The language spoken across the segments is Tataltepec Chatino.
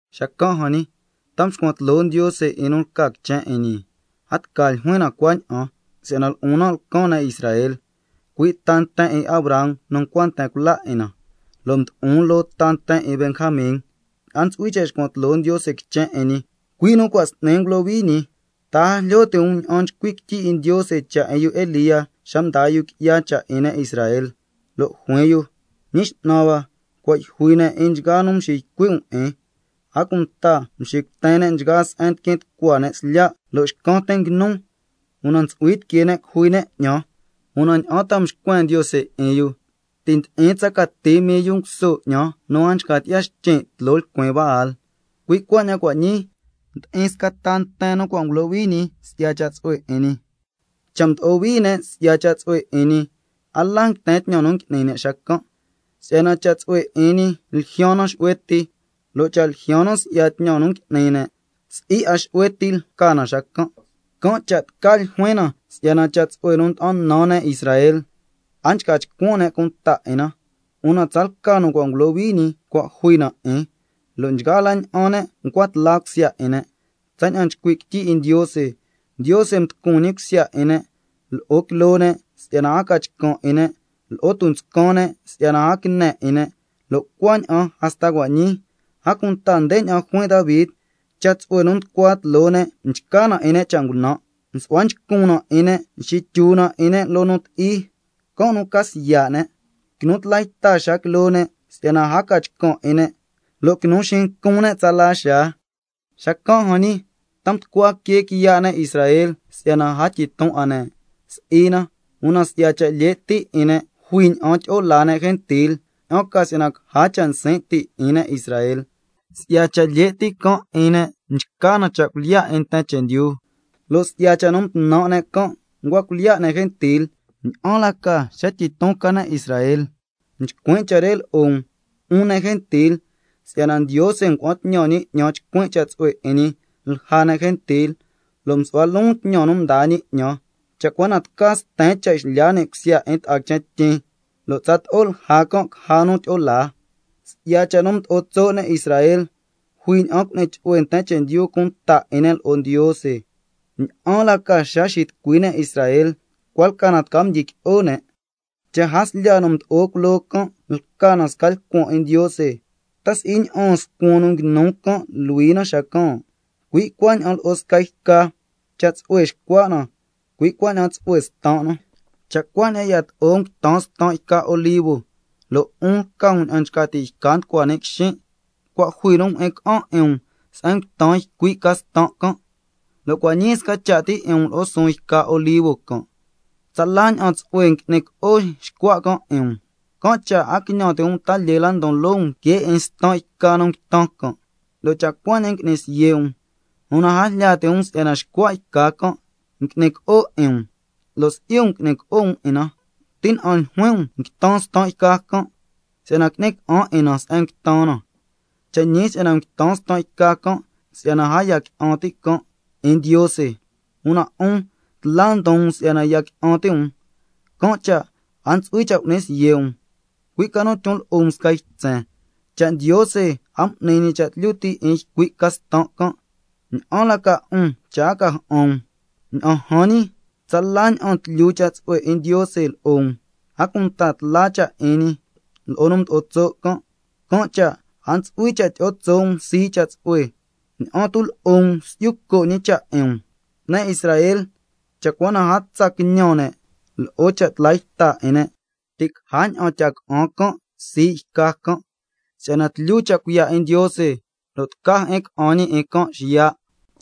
Xacan' jan ñi, ¿ta mscuan tloo Ndiose 'in nu lca quichen 'in ñi? A tca ljuin na cuaña'an, si'yana lo'on nan' lcan ne' Israel, cui' ta nten 'in Abraham nu ncua nten cula 'in na, lo' mdo'on loo ta nten 'in Benjamin. A ntsu'hui cha' xcuan tloo Ndiose quichen 'in ñi, cui' nu cua' s'ni ngulohui ñi. ¿Ta a jlyo ti' um ña'an nchcui' quityi 'in Ndiose cha' 'in yu Elía xa mdaa yu qui'ya cha' 'in ne' Israel? Lo' juin yu: —Ñi X'nan hua, cua' yjui ne' 'in nchgaa yu nu mxiycui' um 'in, a cunta mxicuten ne' nchgaa se'en ndiquin tucua ne' slya', lo' xcan tin nguinun, una ntsu'hui tiquee ne' cujui ne' 'ñan—. Una, ¿ña'an ta mxcuen Ndiose 'in yu? —Ti' ndi'in tsa cati mii yu nguso 'ñan nu a nchca tyi'ya xtyin' tloo lcuin Baal—. Cui' cuaña'an cua' ñii, ndi'in sca ta nten nu cua' ngulohui ñi si'ya cha' tsu'hue 'in ñi. Cha' mdo'o hui ne' si'ya cha' tsu'hue 'in ñi, a la nguiten tñan nu ngui'ni ne' xacan', si'yana cha' tsu'hue 'in ñi ljyaan na xu'hue ti. Lo' cha' ljyaan na si'ya tñan nu ngui'ni ne', si'i 'a xu'hue ti ljyaan na xacan'. Can' cha' tca ljuin na si'yana cha' tsu'hue nu nda'an nan ne' Israel, a nchca chcuan ne' cunta 'in na, una tsalca nu cua' ngulohui ñi cua' jui na 'in, lo' nchgaa la ña'an ne' ncua tla cusya 'in ne', tsaña'an nchcui' quityi 'in Ndiose: —Ndiose mducun cusya 'in ne', lo'o quiloo ne' si'yana a ca chcan' 'in ne', lo'o tunscan ne' si'yana a quine 'in ne', lo' cuaña'an hasta cua' ñii—. A cunta ndeña'an juin Davi: —Cha' tsu'hue nu nducua tloo ne' chca na 'in ne' cha' ngunan', su'hua nchcun na 'in ne', xityu na 'in ne' loo nu ti'i, can' nu ca siya' ne'. Quinu tla yta xaa quiloo ne' si'yana a ca chcan' 'in ne', lo' quinu xincun ne' tsala xaa—. Xacan' jan ñi, ¿ta mducua quee quiya' ne' Israel si'yana a tyiton 'a ne'? Si'i na, una si'ya cha' lye' ti' 'in ne' jui ña'an tyi'o laa ne' gentil, ña'an ca si'yana caja cha' nsin' ti' 'in ne' Israel. Si'ya cha' lye' ti' can' 'in ne' mchca na cha' cuilyiya' 'in nten chendyu, lo' si'ya cha' nu ngunan' ne' can' ncua cuilyiya' ne' gentil, ¿ña'an la ca xa tyiton ca ne' Israel? Nchcuin' cha' re lo'o um, 'un ne' gentil, si'yana Ndiose ngua'an tñan ñi 'ñan chcuin' cha' tsu'hue 'in ñi lja ne' gentil, lo' msu'hua loon tñan nu mdaa ñi 'ñan, cha' cua na tca sten cha' xlya ni' cusya 'in ta'a quichen tyin, lo' tsato'o lja can' caja nu tyi'o laa. Si'ya cha' nu mdo'o tso' ne' Israel, jui ña'an cu'ni chu'hue nten chendyu cunta 'in ne' lo'o Ndiose, ¿ña'an la ca xa xitucui ne' Israel? Cua' lca na tca mdyiqui'o ne'. Cha' jaslya nu mdo'o culoo can' lca na sca lcuan 'in Ndiose, ¿ta si'i ña'aan scuan nu nguinu can' luhui na xacan'? Cui' cuaña'an lo'o sca yca, cha' tsu'hue xcua' na, cui' cuaña'an tsu'hue stan' na. Cha' cuaña'an yato'o nguitan stan' yca olivo, lo' 'un lca um ña'an nchca ti' yca nu nducua ni' quixin', cua' jui nu mjyi'in ca'an 'in um se'en nguitan ycui' ca stan' can', lo' cua' ñii sca cha' ti 'in um lo'o suun yca olivo can', tsala ña'an tsu'hue ngui'ni co'o xcua' can' 'in um. Can' cha' a quiñan ti' um ta lyee la ndon loo um que 'in stan' yca nu nguitan can', lo' cha' cuaña'an ngui'ni siye' um, una a jlya ti' um si'yana xcua' yca can' ngui'ni co'o 'in um, lo' si'i um ngui'ni co'o um 'in na. Tina'an ljuin um: Nguitan stan' yca can' si'yana qui'ni ca'an 'in na se'en nguitan na. Cha' ñi si'yana nguitan stan' can' si'yana a ya qui'an ti' can' 'in Ndiose, una 'un tla ndon um si'yana ya qui'an ti' um, can' cha' a ntsu'hui cha' cu'ni siye' um, cui' ca nu tyon lo'o um sca ytsen. Cha' Ndiose a m'ni ñi cha' tlyu ti' 'in ycui' ca stan' can', ¿ña'an la ca 'un cha' a ca ja'an um? Ña'an jan ñi, tsala ña'an tlyu cha' tsu'hue 'in Ndiose lo'o um, a cunta tla cha' 'in ñi lo'o nu mdo'o tso' can'. Can' cha' a ntsu'hui cha' tyi'o tso' um sii' cha' tsu'hue, ña'an tu' lo'o um si'yu co' ñi cha' 'in um. Ne' Israel, cha' cua na a tsa quiñan ne' lo'o cha' tla yta 'in ne', ti' caja ña'an tya ca'an can' sii' yca can', si'yana tlyu cha' cuiya' 'in Ndiose lo' tca jyi'in ca'an ñi 'in can' xiya'.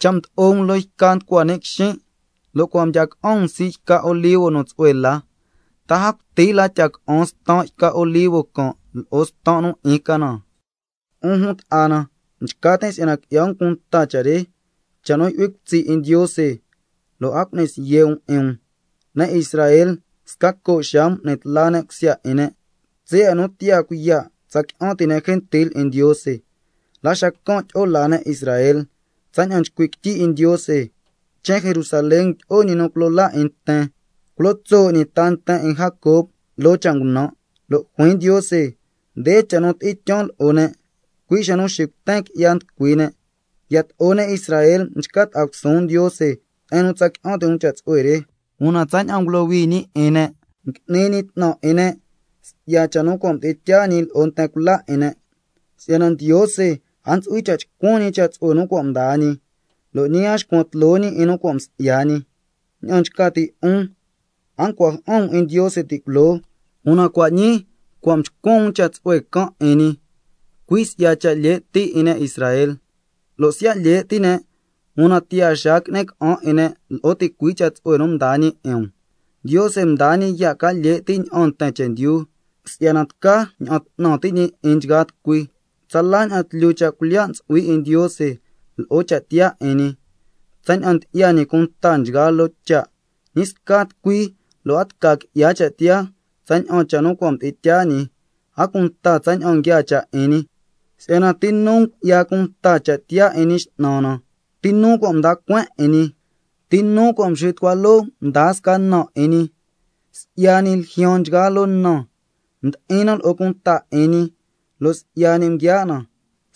Cha' mdo'o um loo yca nducua ni' quixin', lo' ncua mdya ca'an um sii' xca yca olivo nu tsu'hue la, ¿ta a cuti la tya ca'an stan' yca olivo can' lo'o stan' nu 'in ca na? 'Un jun ta'a na, nchca tin' si'yana qui'ya um cunta cha' re, cha' nu yu'hui cutsi' 'in Ndiose, lo' a cu'ni siye' um 'in um, si'yana ne' Israel, sca co' xaa m'ni tla ne' cusya 'in ne' tsaya' nu tiyaa cuiya' tsa qui'an ti' ne' gentil 'in Ndiose, la xacan' tyi'o laa ne' Israel, tsaña'an nchcui' quityi 'in Ndiose: —Quichen Jerusalén tyi'o Ñi nu Culo Laa 'in nten, culo tso' ñi ta nten 'in Jacob loo cha' ngunan'—. Lo' juin Ndiose: —Nde cha' nu tyi'in tyaan lo'o ne', cui' xa nu xicuten qui'ya nducui ne'—. Yato'o ne' Israel mchca ta'a cusuun Ndiose se'en nu tsa qui'an ti' um cha' tsu'hue re, una tsaña'an ngulohui ñi 'in ne', ngui'ni ñi 'tnan 'in ne' si'ya cha' nu cua' mdi'in tyaa ñi lo'o nten cula 'in ne'. Si'yana Ndiose a ntsu'hui cha' chcuan ñi cha' tsu'hue nu cua' mdaa ñi, lo' ñi a xcuan tloo ñi 'in nu cua' msi'ya ñi. Ña'an nchca ti' 'un, a ncua ja'an um 'in Ndiose ti' culoo, una cua' ñii cua' mchcuan um cha' tsu'hue can' 'in ñi, cui' si'ya cha' lye' ti' 'in ne' Israel. Lo' siya' lye' ti' ne', una tiyaa xaa qui'ni ca'an 'in ne' lo'o ticui' cha' tsu'hue nu mdaa ñi 'in um. Ndiose mdaa ñi ya' ca lye' ti' ña'aan nten chendyu, si'yana tca ña'an 'tnan ti' ñi 'in nchgaa tucui. ¡Tsala ña'an tlyu cha' cuilyiya' ntsu'hui 'in Ndiose lo'o cha' tiyaa 'in ñi, tsaña'an ndyi'ya ñi cunta nchgaa loo cha'! ¡Ñi sca tucui lo' a tca qui'ya cha' tiyaa tsaña'an cha' nu cua' mdi'in tyaa ñi, a cunta tsaña'an nguiaa cha' 'in ñi! Si'yana, ¿—ti nu ngu'ya cunta cha' tiyaa 'in Ñi X'nan na? ¿Ti nu cua' mda cueen 'in ñi—? ¿—Ti nu cua' mxitucua loo mdaa sca na 'in ñi—? Si'ya ñi ljyaan nchgaa loo na, ndi'in na lo'o cunta 'in ñi, lo' si'ya ñi nguiaa' na.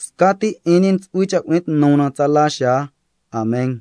Scati 'in ñi ntsu'hui cha' cu'ni tnu na tsala xaa. Amen.